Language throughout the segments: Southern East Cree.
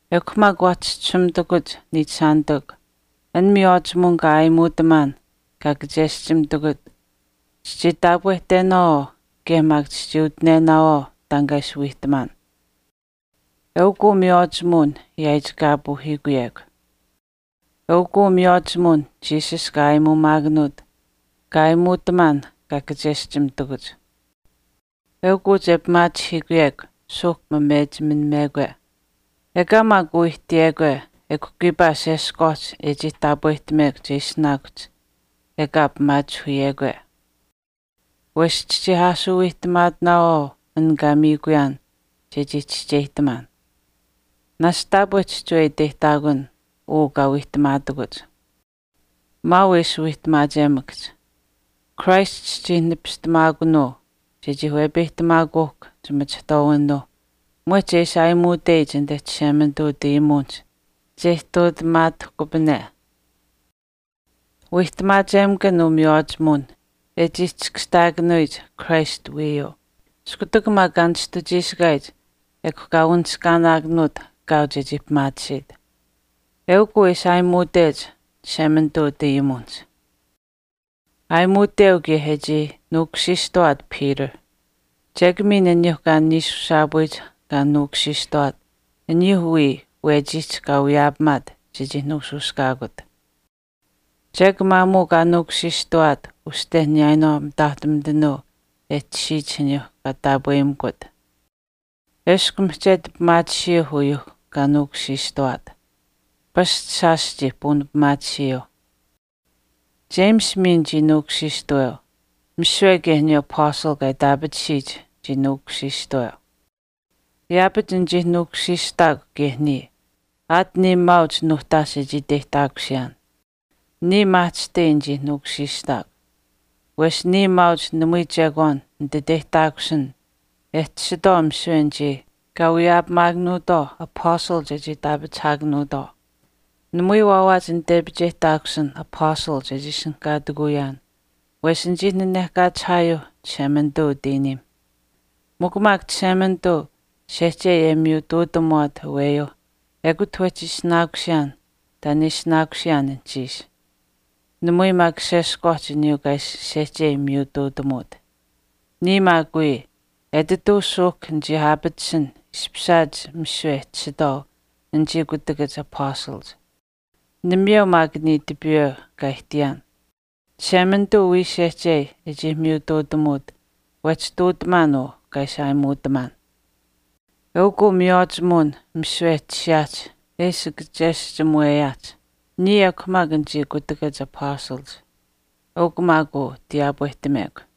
Ekw maak waa chischisuumitakuch, niichishaanitikw, an miywaachimuwin kaa aayimuutamaan kaa kacheschimitakuch, chichii taapwehtenaawaau kaye maak chichii utinenaawaau taan kaa ishi wiihtamaan. Eukuu miywaachimuwin yaaichikaapuuhiikuyekw. Eukuu miywaachimuwin Jesus kaa aayimuumaakanuut kaa aayimuutamaan kaa kacheschimitakuch. Eukuu che pimaachihiikuyekw suuhk mamechiminamekwe. Ekaa maak uu ihtiyekwe ekw kiipaa sheshkwaaht e chii taapwehtamekw che ishinaakuhch ekaa pimaachihiikuyekwe. Wesh chichii aashuu wiihtamaatinaawaau an kaa miikuyaan chechii chischeyihtamaan. Naashch taapwe chihchiwe iteyihtaakun uu kaa waawiihtamaatakuch. Maau e ishi wiihtamaachemakahch. Christ chichii nipistamaakunuu chechii wepeyihtamaakuuhkw chimachihtwaawinuuh mwehch e ishi aayimuuteyich anite Chishemanituu utayimuwinihch che ihtuutamaatahkupane. Wiihtamaachemakan uu miywaachimuwin e chii chiskashtaakanuyich Christ wiiyuu. Iskutak maak kaa nishtuchiishikaayich ekw kaa wanishkaanaakanuut kaau chechii pimaatisiit. Eukw uu e ishi aayimuutech Chishemanituu utayimuwinihch. Aayimuuteu kaye e chii nuukushiishtawaat Peter. Chek miin aniyuuh kaa niishushaapuyich kaa nuukushiishtawaat aniyuuh wiya wechiihch kaa wiyaapamaat chechii nuushuushkaakut. Chek maamuu kaa nuukushiishtawaat uste niyaayinwaau mitaahtumitanuu e tashiyich aniyuuh kaa taapweyimikut. Eshkw mihchetu pimaatisiyuuh uyuuh kaa nuukushiishtawaat. Pasch shaash chii puunipimaatisiyuuh. James miin chii nuukushiishtaweu. Misiwe kaye aniyuu apastal kaa itaapatisiyich chii nuukushiishtaweu. Yaapach nichii nuukushiishtaakw kaye niya aat niya maauch nuuhtaash e chii iteyihtaakusiyaan. Niya maahchishtai nichii nuukushiishtaakw. Wesh niya maauch namui chekwaan nititeyihtaakusin e tashitwaau misiwe anichii kaa wiyaapamaakanuutwaau apastal chechii itaapachihaakanuutwaau. Namui waawaach nitepicheyihtaakusin apastal chechii ishinihkaatikuyaan wesh nichii nanehkaachihaayuuh Chishemanituu utiiniimh. Mikw maak Chishemanituu sehchei e miyutuutamuwaat aweyuuh ekut wehchi ishinaakusiyaan taan e ishinaakusiyaan anuhchiish. Namui maak sheshkwaaht aniyuu kaa ishi sehchei miyutuutamuut. Niya maak wii, etituu suuhk nichii aapatisin ishpishaat misiwe e tashitwaau anichii kutakach apastalach. Namayeu maak niya tipiiwe kaa ihtiyaan. Chishemanituu wiya sehchei e chii miyutuutamut wehchi ihtuutamaan uu kaa ishi aayimuutamaan. Eukw uu miywaachimuwin misiwe e tashiyaahch e ishi kacheschimuweyaahch, niya ekw maak anichii kutakach apastalach. Eukw maak uu tiyaapwehtamekw.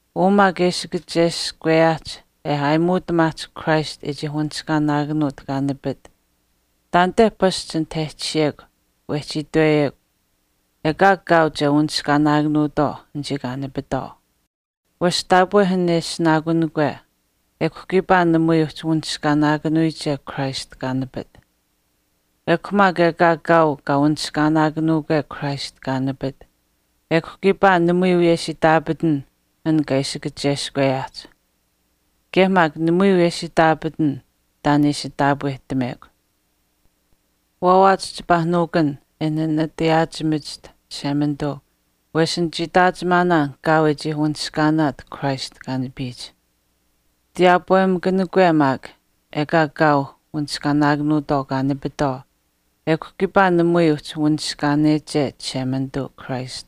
Uu maak e ishi kacheskweyaahch e aayimuutamaahch Christ e chii wanishkaanaakanuut kaa nipit, taanite pasch anit e tashiyekw wehchi itweyekw ekaa kaau che uhchi wanishkaanaakanuutwaau anichii kaa nipitwaau. Wesh taapwe an e ishinaakunikwe ekw kiipaa namui uhchi wanishkaanaakanuyiche Christ kaa nipit. Ekw maak ekaa kaau uhchi wanishkaanaakanuukwe Christ kaa nipit ekw kiipaa namui wiyesh itaapatan an kaa ishi kacheskweyaahch. Kaye maak namui wiyesh itaapatan taan e ishi taapwehtamekw. Waawaach chipaa nuukun e nanatayaachimachiht Chishemanituu wesh nichii itaachimaanaan kaau e chii wanishkaanaat Christ kaa nipiyich. Tiyaapwemakanikwe maak ekaa kaau wanishkaanaakanuutwaau kaa nipitwaau ekw kiipaa namui uhchi wanishkaaneche Chishemanituu Christ.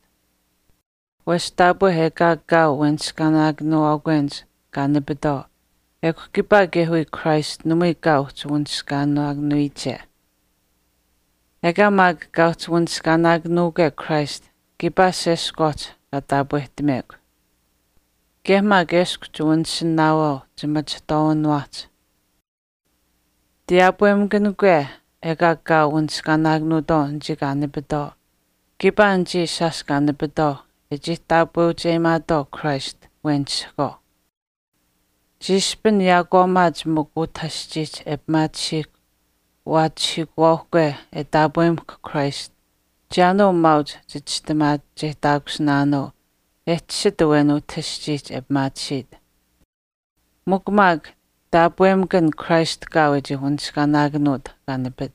Wesh taapwe ekaa kaau weniskaanaakanuuwaakwenich kaa nipitwaau ekw kiipaa kaye wiya Christ namui kaau uhchi wanishkaanaakanuwiyiche. Ekaa maak uhchi wanishkaanaakanuukwe Christ kiipaa sheshkwaaht kaa taapweyimekw. Kaye maak eshkw chiwanishinaawaau chimachihtwaawiniwaahch. Tiyaapwemakanikwe ekaa kaau wanishkaanaakanuutwaau anichii kaa nipitwaau kiipaa anichii shaash kaa nipitwaau e chii taapweucheyimaatwaau Christ wenisihkwaau. Chiishpin yaakwaamaach mikw utah aschiihch e pimaatisiihkw waahchihiikuwaauhkwe e taapweucheyimahkw Christ chiyaanuu maauch chichistimaacheyihtaakusinaanuu e tashit awen utah aschiihch e pimaatisiit. Mikw maak taapwemakan Christ kaau e chii wanishkaanaakanuut kaa nipit.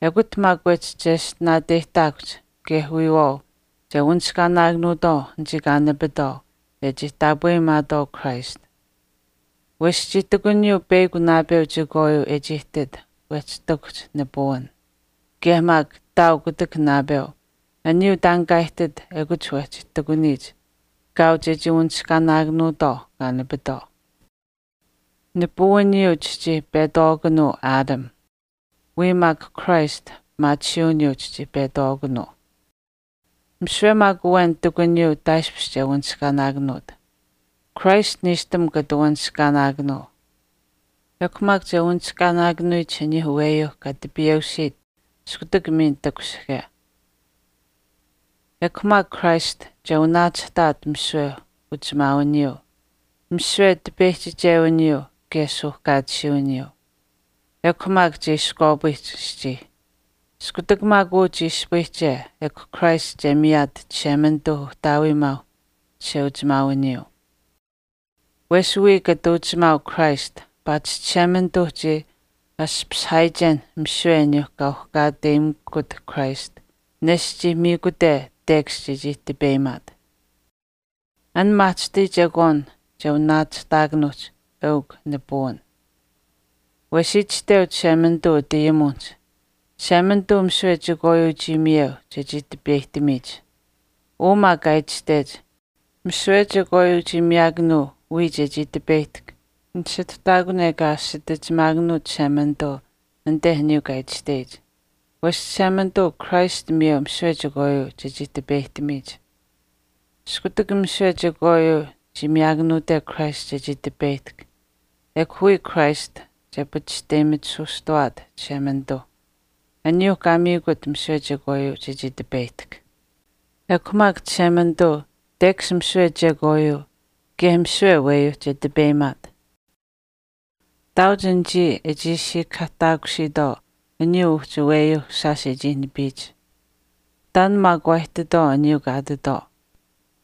Ekut maak wehchi cheshtinaateyihtaakuhch kaye wiyawaau che wanishkaanaakanuutwaau anichii kaa nipitwaau e chii taapweyimaatwaau Christ. Wesh chii ihtakuniyuu peyakw naapeu chekwaayuu e chii ihtit wehchi ihtakuhch nipuwin, kaye maak ihtaau kutak naapeu aniyuu taan kaa ihtit ekut wehchi ihtakuniyich kaau chechii wanishkaanaakanuutwaau kaa nipitwaau. Nipiwiniyuu chichii petwaakunuu Adam, wiya maak Christ pimaatisiiwiniyuu chichii petwaakunuu. Misiwe maak awen ihtakuniyuu taaishpish che wanishkaanaakanuut. Christ niishtam kata waanishkaanaakanuu. Ekw maak che wanishkaanaakanuyich aniyuuh aweyuuh kaa tipiyeusiit iskutak miin takushihke. Ekw maak Christ che wanaachihtaat misiwe uchimaawiniyuu, misiwe tipeyihchichewiniyuu kaye suuhkaatisiiwiniyuu. Ekw maak che iskwaapayihch aschii. Iskutak maak uu chii ispayihche ekw Christ che miyaat Chishemanituuh Uhtaawiimaauh chisheuchimaawiniyuu. Wesh wiya kata uchimaau Christ paatish Chishemanituuh chii ashpashihaayichenh misiwe aniyuuh kaa uhkaateyimikut Christ nesht chii miikute tekash chechii tipeyimaat. An maahchishtai chekwaan che wanaachihtaakanuuch eukw nipuwin. Wesh itashteu Chishemanituu utayimuwinihch, “Chishemanituu misiwe chekwaayuu chii miyeu chechii tipeyihtamiyich.” Uu maak kaa itashtech misiwe chekwaayuu chii miyaakanuu wiya chechii tipeyihtahk nisituhtaakun ekaa asitichimaakanuut Chishemanituu anit aniyuu kaa itashteyich. Wesh Chishemanituu Christ miyeu misiwe chekwaayuu chechii tipeyihtamiyich. Iskutak misiwe chekwaayuu chii miyaakanuute Christ chechii tipeyihtahk ekw wiya Christ che pachishteyimitisuustawaat Chishemanituu, aniyuuh kaa miikut misiwe chekwaayuu chechii tipeyihtahk. Ekw maak Chishemanituu tekash misiwe chekwaayuu kaye misiwe aweyuuh che tipeyimaat. Ihtaauch anichii e chii siikahaahtaakusiitwaau aniyuu uhchi aweyuuh shaash e chii nipiyich. Taan maak waa ihtitwaau aniyuu kaa ihtitwaau.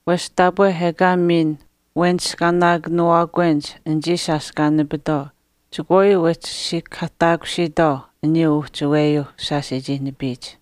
Wesh taapwe ekaa miin weniskaanaakanuuwaakwenich anichii shaash kaa nipitwaau chekwaayuu wehchi siikahaahtaakusiitwaau aniyuu uhchi aweyuuh shaash e chii nipiyich.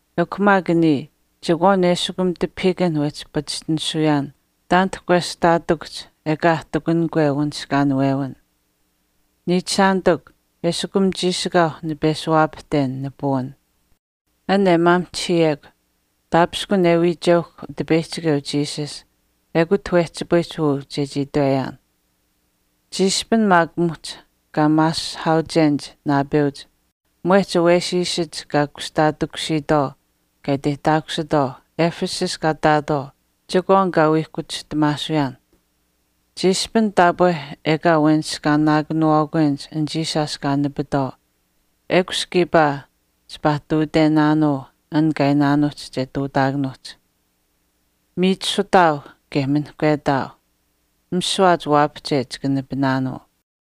Ekw maak niya, chekwaan eshikum tipahiikanh wehchi pachishtinisuyaan taanit kwestaatikuhch ekaa e ihtakunikwe wanishkaanuwin. Niichishaanitikw, eshikum chiishikaauh nipeshuwaapahten nipuwin. An e ishi maamihchihiyekw taapishkun e wiicheuhkw Utipeyihchikeu Jesus ekut wehchipayihch uu chechii itweyaan. Chiishpin maak muhch kaa maasihaauchenich naapeuch mwehch awesiisach kaa kushtaatikusiitwaau kaa iteyihtaakusitwaau Ephesus kaa ihtaatwaau chekwaan kaa wiihkuchihtamaasuyaan. Chiishpin taapwe ekaa weniskaanaakanuuwaakwenich anichii shaash kaa nipitwaau ekush kiipaa chipaa ihtuutenaanuu an kaa iinaanuuhch che ihtuutaakanuuhch, “Miichisutaau kaye minihkwetaau, mishuwaach waapahche chika nipinaanuu.”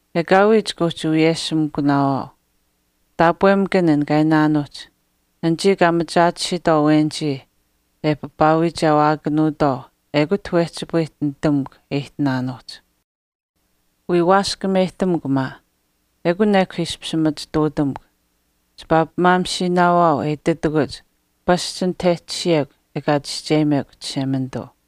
Ekaawii chika uhchi wiyeshimikunaawaau. Taapwemakan an kaa iinaanuuhch, “Anichii kaa machaatisiitwaau awenich e papaawiichewaakanuutwaau ekut wehchipayihch nitamukw e ihtinaanuuhch.” Wii waashkameyihtamukw maa. Ekun ekw ishpish machituutamukw. Chipaa pimaamishiinaawaau e ititakuch pasch anit e tashiyekw ekaa chischeyimekw Chishemanituu.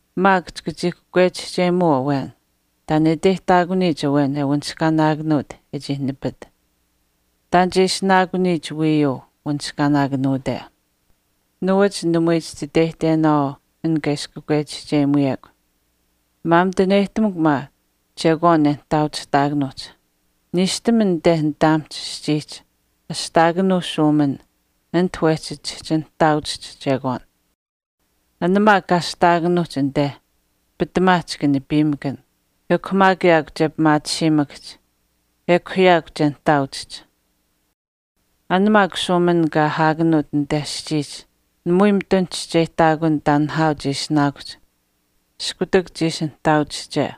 Maak chika chii kakwechihcheyimuu awen, “Taan e iteyihtaakuniyich awen e wanishkaanaakanuut e chii nipit. Taan che ishinaakuniyich wiiyuu wanishkaanaakanuute.” Nuwach namui chititeyihtenaawaau an kaa ishi kakwechihcheyimuyekw. Maamituneyihtamukw maa chekwaan e nihtaauchihtaakanuuhch. Niishtam anite nitaamihch aschiihch ashtaakanuu shuumin ati wehchi chihchi nihtaauchihch chekwaan. An maak kaa ashtaakanuuhch anite pitamaa chika nipiimakan. Ekw maak yaakw che pimaatisiimakahch, ekw yaakw che nihtaauchihch. An maak shuumin kaa ahaakanuut anite aschiihch namui mitun chischeyihtaakun taan nihaau che ishinaakuhch iskutak chiishi nihtaauchihche.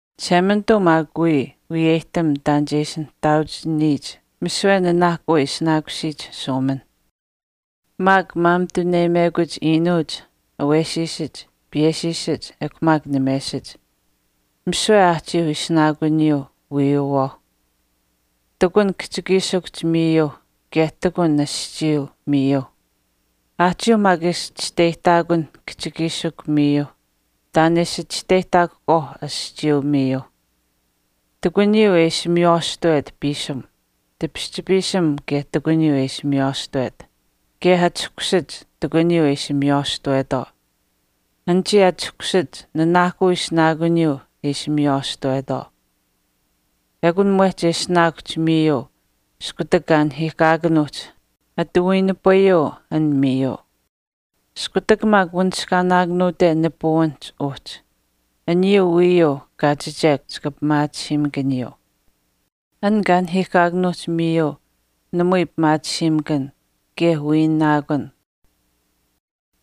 Chishemanituu maak wiya wiyeyihtam taan che ishi nihtaauchihcheyich misiwe nanaahkuu e ishinaakusiyich shuuminh. Maak maamituneyimekuch iinuuch, awesiisach, piyeshiishach ekw maak namesach. Misiwe aahchiiuh ishinaakuniyuu wiiyuwaauh. Ihtakunh kihchikiishikw miiyuuh kaye ihtakunh aschiiyuu miiyuuh. Aahchiiuh maak ishi chisteyihtaakunh kihchikiishikw miiyuuh taan e ishi chisteyihtaakuhkwaau aschiiyuu miiyuuh. Ihtakuniyuu e ishi miywaashtawet piisim. Tipischipiisim kaye ihtakuniyuu e ishi miywaashtawet. Kaye achahkushach ihtakuniyuu e ishi miywaashtawetwaau. Anichii achahkushach nanaahkuu ishinaakuniyuu e ishi miywaashtawetwaau. Ekun mwehch e ishinaakuhch miiyuu, iskutak kaa nahiihkaakanuuhch ati wiinipayuu an miiyuu. Iskutak maak wanishkaanaakanuute nipuwinihch uhchi, aniyuu wiiyuu kaachiche chika pimaatisiimakaniyuu. An kaa nahiihkaakanuuhch miiyuu namui pimaatisiimakan kaye wiinaakun.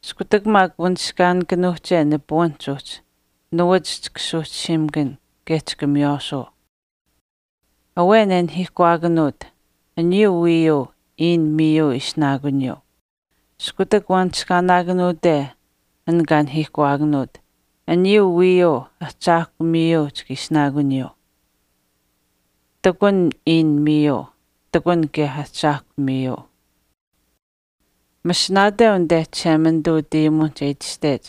Iskutak maak wanishkaanikanuuhche nipuwinihch uhchi nuwach chika suuhchisiimakan kaye chika miywaashuu. Awen e nahiihkuwaakanuut, aniyuu wiiyuu iin miiyuu ishinaakuniyuu. Iskutak wanishkaanaakanuute an kaa nahiihkuwaakanuut, aniyuu wiiyuu ahchaahkw miiyuu chika ishinaakuniyuu. Ihtakun iin miiyuu. Ihtakun kaye Ahchaahkw miiyuu. Masinaateu anite Chishemanituu utayimuwinihch e itashtech,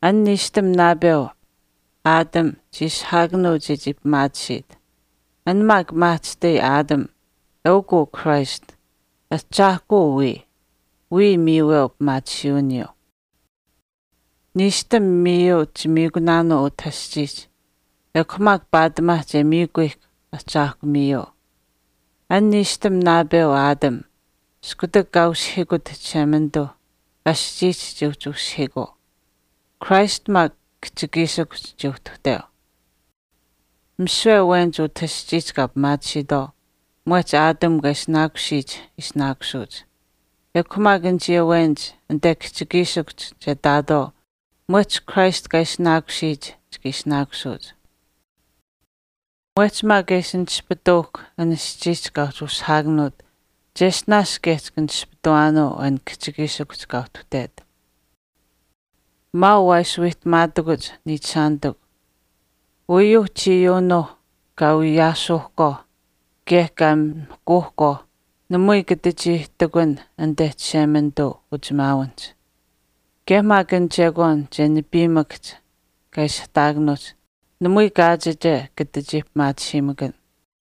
“An niishtam naapeu, Adam, chii ishihaakanuu chechii pimaatisiit.” An maak maahchishtai Adam eukuu Christ, Ahchaahkuu wiya, wiya miiweu pimaatisiiwiniyuu. Niishtam miiyuu chimiikunaanuu utah aschiihch. Ekw maak paatimaa che miikuyihkw ahchaahkw miiyuu. An niishtam naapeu Adam, iskutak kaa usihiikut Chishemanituuh sischuuhch chii uhchi usihiikuu. Christ maak kihchikiishikuhch chii uhtuhteu wiya. Misiwe awenich utah aschiihch kaa pimaatisiitwaau mwehch Adam kaa ishinaakusiyich ishinaakusuuch. Ekw maak anichii awenich anite kihchikiishikuhch che ihtaatwaau mwehch Christ kaa ishinaakuniyich chika ishinaakusuuch. Mwehch maak e ishi nispituuhkw an sischuuhch kaa uhchi ushihaakanuut cheshtinaash kaye chika nispituwaanuu an kihchikiishikuhch kaa uhtuhtet. Maau waa ishi wiihtamaatakuch niichishaanitikw. Uyuuh chiiyuunuuh kaa wiyaasuuhkwaau kaye kaa mihkuuhkwaah namui kata chii ihtakunh anite Chishemanituu uchisheuchimaawinihch, kaye maak an chekwaan che nipiimakahch kaa ishihtaakanuuhch namui kaachiche kata chii pimaatisiimakan.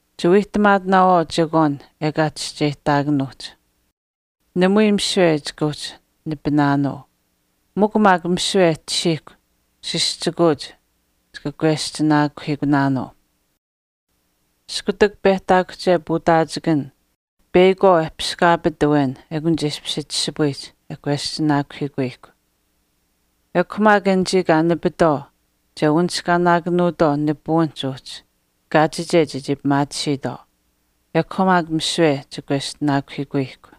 Chiwiihtamaatinaawaau chekwaan ekaa chischeyihtaakunuuhch. Namui misiwe chika uhchi nipinaanuu. Mikw maak misiwe e tashiihkw sischikuuch chika kweschinaakuhiikunaanuu. Iskutak pehtaakuhche puutaachikan peyakwaau e piskaapit awen ekun che ishpish chishipayihch e kweschinaakuhiikuyihkw. Ekw maak anichii kaa nipitwaau che wanishkaanaakanuutwaau nipuwinihch uhchi kaachiche chechii pimaatisiitwaau. Ekw maak misiwe che kweschinaakuhiikuyihkw.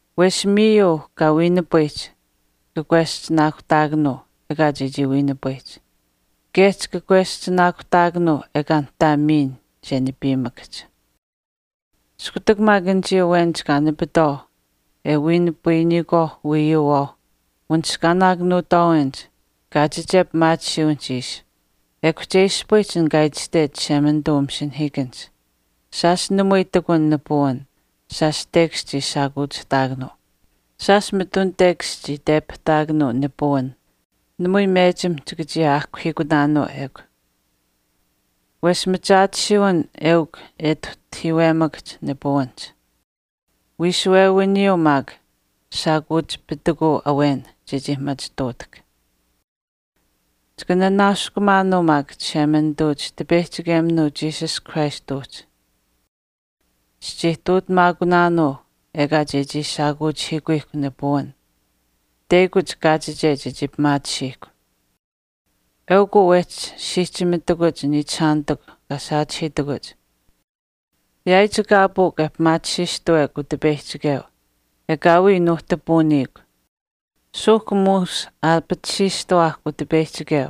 Wesh miiyuu kaa wiinipayihch chika kweschinaakuhtaakanuu ekaa chechii wiinipayihch. Kaye chika kweschinaakuhtaakanuu ekaa nihtaa miin che nipiimakahch. Iskutak maak anichii awenich kaa nipitwaau e wiinipayikwaauh wiiyuuwaauh wanishkaanaakanuutwaawenich kaachiche pimaatisiiwinihch ishi ekw che ispayihch an kaa itashtech Chishemanituu umasinahiikanihch, Shaash namui ihtakun nipuwin, shaash tekash chii shaakuuchihtaakanuu. Shaash mitun tekash chii tepihtaakanuu nipuwin. Namui mechim chika chii aahkuhiikunaanuu ekw. wesh machaatisiiwin eukw e ituhtahiiwemakahch nipuwinihch. Wiishuwewiniyuu maak shaakuuchipitikuu awen chechii machituutahk. Chika nanaaskumaanuu maak Chishemanituu chitipeyihchikeminuu Jesus Christ uhchi. Chichii ihtuutamaakunaanuu ekaa chechii shaakuuchihiikuyihkw nipuwin, teyakuch kaachiche chechii pimaatisiihkw. Eukw maak uu wehchi siihchimitakuch niichishaanitikw kaa saachihiitakuch, yaaichikaapukw e pimaatisiistuwekw Utipeyihchikeu. Ekaawii nuuhtapuuniikw. Suuhk muush aapatisiishtuwaahk Utipeyihchikeu.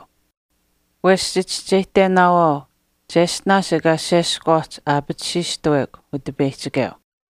Wesh chichischeyihtenaawaau cheshtinaash ekaa sheshkwaaht aapatisiishtawekw Utipeyihchikeu.